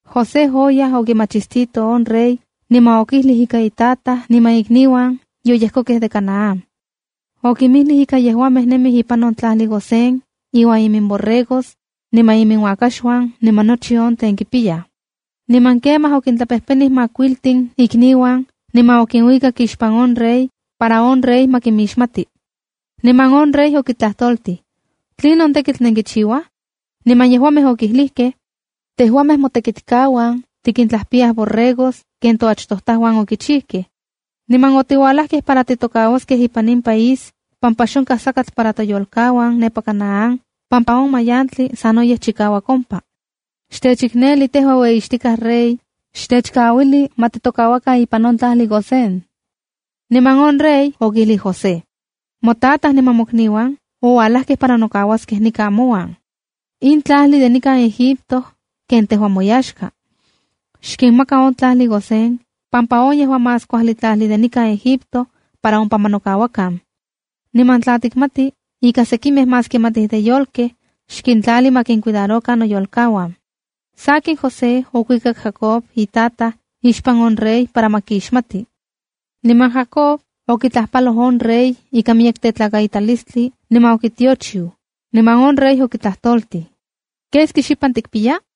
José oyaj okimachistito on rey niman okijlij ika itataj niman ikniuan yoyejkokej de Canaán. Okinmijlij ika yejuamej nemij ipan on tlajli Gosén iuan iminborregos, niman iminuakaxuan niman nochi on tlen kipiyaj. Niman kemaj, okintlapejpenij makuiltin ikniuan niman okinuikak ixpan on rey para on rey ma kimixmati. Niman on rey okintlajtoltij: —¿Tlinon tekitl nenkichiuaj? Niman yejuamej okilijkej: —Tejuamej motekitkauan tikintlajpiyaj borregos ken toachtojtajuan okichijkej. Niman otiualajkej para titokauaskej ipan in país pampa xonkaj sakatl para toyolkauan nepa Canaán pampa on mayantli sanoyej chikauak ompa. Xtechikneli tejua ueyixtikaj rey, xtechkauili ma titokauakan ipan on tlajli Gosén. Niman on rey okijlij José: —Motataj niman mokniuan oualajkej para nokauaskej nikan mouan. In tlajli de nikan Egipto ken tejua moyaxka. Xkinmaka on tlajli Gosén pampa on yejua más kuajli tlajli de nikan Egipto, para ompa ma nokauakan. Niman tla tikmati ika sekimej más kimatij de yolkej, xkintlali ma kincuidarokan noyolkauan. Sakin, José okuikak Jacob on itataj ixpan on rey para ma kixmati. Niman Jacob okitlajpaloj on rey ikan miyek tetlakaitalistli niman okitiochiu, niman on rey okitlajtoltij: —¿Keski xipan tikpiya?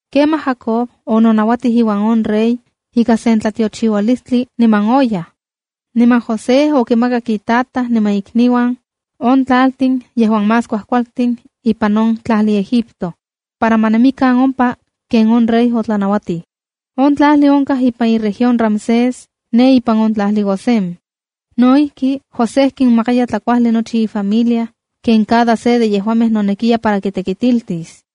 Kemaj Jacob ononauatij iuan on rey ika sen tlatiochiualistli niman oyaj. Niman José okimakak itataj niman ikniuan on tlaltin yejuan más kuajkualtin ipan on tlajli Egipto, para ma nemikan ompa ken on rey otlanauatij. On tlajli onkaj ipan iueyitlalpan Ramsés ne ipan on tlajli Gosén. No ijki, José kinmakaya tlakuajli nochi ifamilia ken cada se de yejuamej nonekiya para kitekitiltis.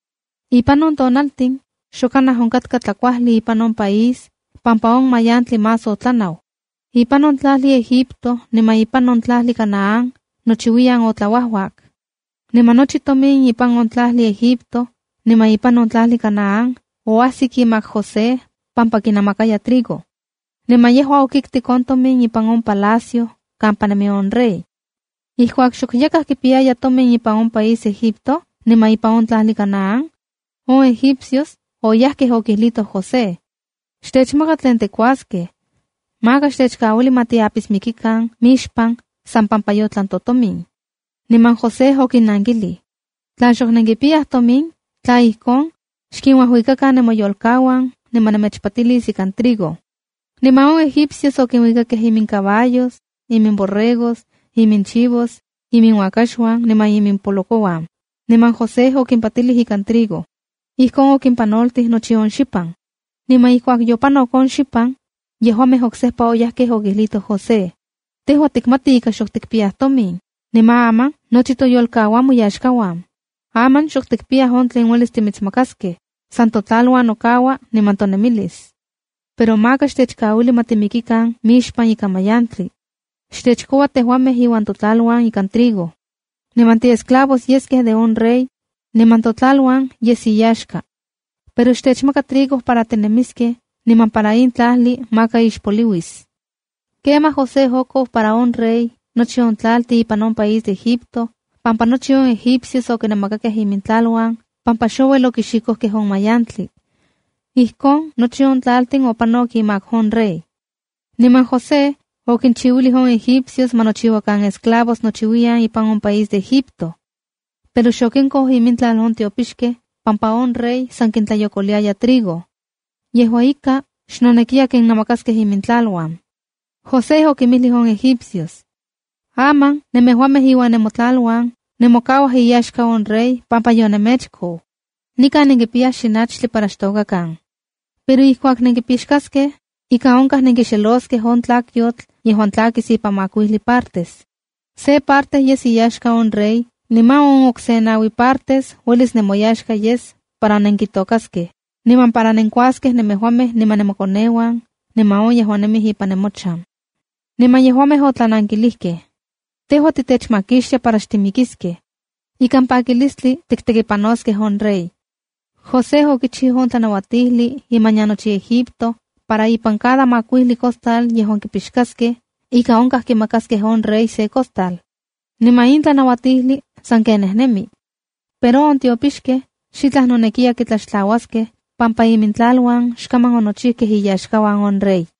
Ipan on tonaltin xok kanaj onkatka tlakuajli ipan on país pampa on mayantli más otlanau. Ipan on tlajli Egipto niman ipan on tlajli Canaán nochiuiyan otlauajuak. Niman nochi tomin ipan on tlajli Egipto niman ipan on tlajli Canaán oajsik imak José pampa kinamakaya trigo. Niman yejua okiktik on tomin ipan on palacio kampa nemi on rey. Ijkuak xok yakaj kipiyaya tomin ipan on país Egipto niman ipan on tlajli Canaán, on egipcios oyajkej okijlitoj José: —¡Xtechmaka tlen tikuaskej! Maka xtechkauili ma tiapismikikan mixpan san pampa yotlan totomin. Niman José okinnankilij: —Tla xok nenkipiyaj tomin, tla ijkon, xkinuajuikakan nemoyolkauan niman nemechpatilis ikan trigo. Niman on egipcios okinuikakej imincaballos, iminborregos, iminchivos, iminuakaxuan niman imimpolokouan, niman José okimpatilij ikan trigo. Ijkon okimpanoltij nochi on xipan. Niman ijkuak opanok on xipan, yejuamej oksejpa oyajkej okijlitoj José: —Tejua tikmati ika xok tikpiyaj tomin, niman aman nochi toyolkauan moyaxkauan. Aman xok tikpiyaj on tlen uelis timitsmakaskej, san totlaluan nokaua niman tonemilis. Pero maka xtechkauili ma timikikan mixpan ika mayantli. Xtechkoua tejuamej iuan totlaluan ikan trigo. Niman tiiesclavos yeskej de on rey, niman totlaluan yes iyaxka. Pero xtechmaka trigo para tinemiskej niman para in tlajli maka ixpoliuis. Kemaj José okou para on rey nochi on tlaltin ipan on país Egipto pampa nochi on egipcios okinamakakej imintlaluan pampa xouel okixikojkej on mayantli. Ijkon nochi on tlaltin opanok imak on rey. Niman José okinchiuilij on egipcios ma nochiuakan esclavos nochiuyan ipan on país de Egipto. Pero xokinkou imintlal on tiopixkej pampa on rey san kintlayokoliaya trigo. Yejua ika, xnonekiya kinnamakaskej imintlaluan. José okinmijlij on egipcios: —Aman nemejuamej iuan nemotlaluan nemokauaj iyaxka on rey pampa yonemechkou. Nikan nenkipiyaj xinachtli para xtokakan. Pero ijkuak nempixkaskej, ika onkaj nenkixeloskej on tlakyotl yejuan tlakis ipan makuijli partes. Se parte yes iyaxka on rey niman on okse naui partes uelis nemoyaxka yes para nenkitokaskej, niman para nenkuaskej nemejuamej niman nemokoneuan niman yejuan nemij ipan nemochan. Niman yejuamej otlanankilijkej: —Tejua titechmakixtia para xtimikiskej. Ikan pakilistli tiktekipanoskej on rey. José okichiu on tlanauatijli imanian nochi Egipto para ipan cada makuijli costal yejuan kipixkaskej ika onkaj kimakaskej on rey se costal. Niman in tlanauatijli sanken nejnemi. Pero on tiopixkej xitlaj noneki kitlaxtlauaskej pampa imintlaluan xkaman onochijkej iyaxkauan on rey.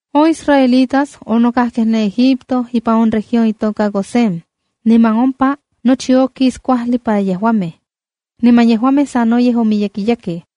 On israelitas onokajkej ne Egipto ipan on región itoka Gosén, niman ompa nochi okis kuajli para yejuamej. Niman yejuamej sanoyej omiyekiyakej.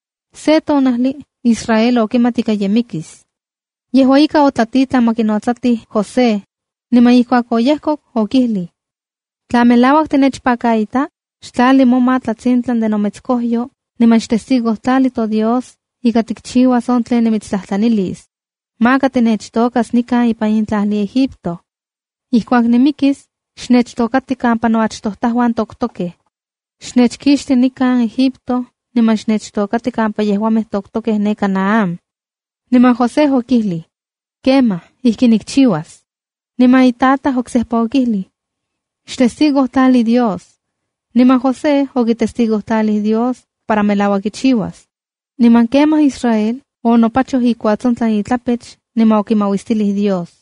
Se tonajli Israel okimat ika ye mikis. Yejua ika, otlatitlan ma kinotsatij José, niman ijkuak oyejkok, okijlij: —Tla melauak tinechpakaita, xtlali moma tlatsintlan de nometskojyo niman xtestigojtlali toDios ika tikchiuas on tlen nimitstlajtlanilis. Maka tinechtokas nikan ipan in tlajli Egipto. Ijkuak nimikis, xnechtokati kampa noachtojtauan toktokej. Xnechkixti nikan Egipto niman xnechtokati kampa yejuamej toktokej ne Canaán. Niman José okijlij: —Kemaj, ijki nikchiuas. Niman itataj oksejpa okijlij: —¡Xtestigojtlali Dios! Niman José okitestigojtlalij Dios para melauak kichiuas. Niman kemaj Israel onopachoj ikuatsontlan itlapech niman okimauistilij Dios.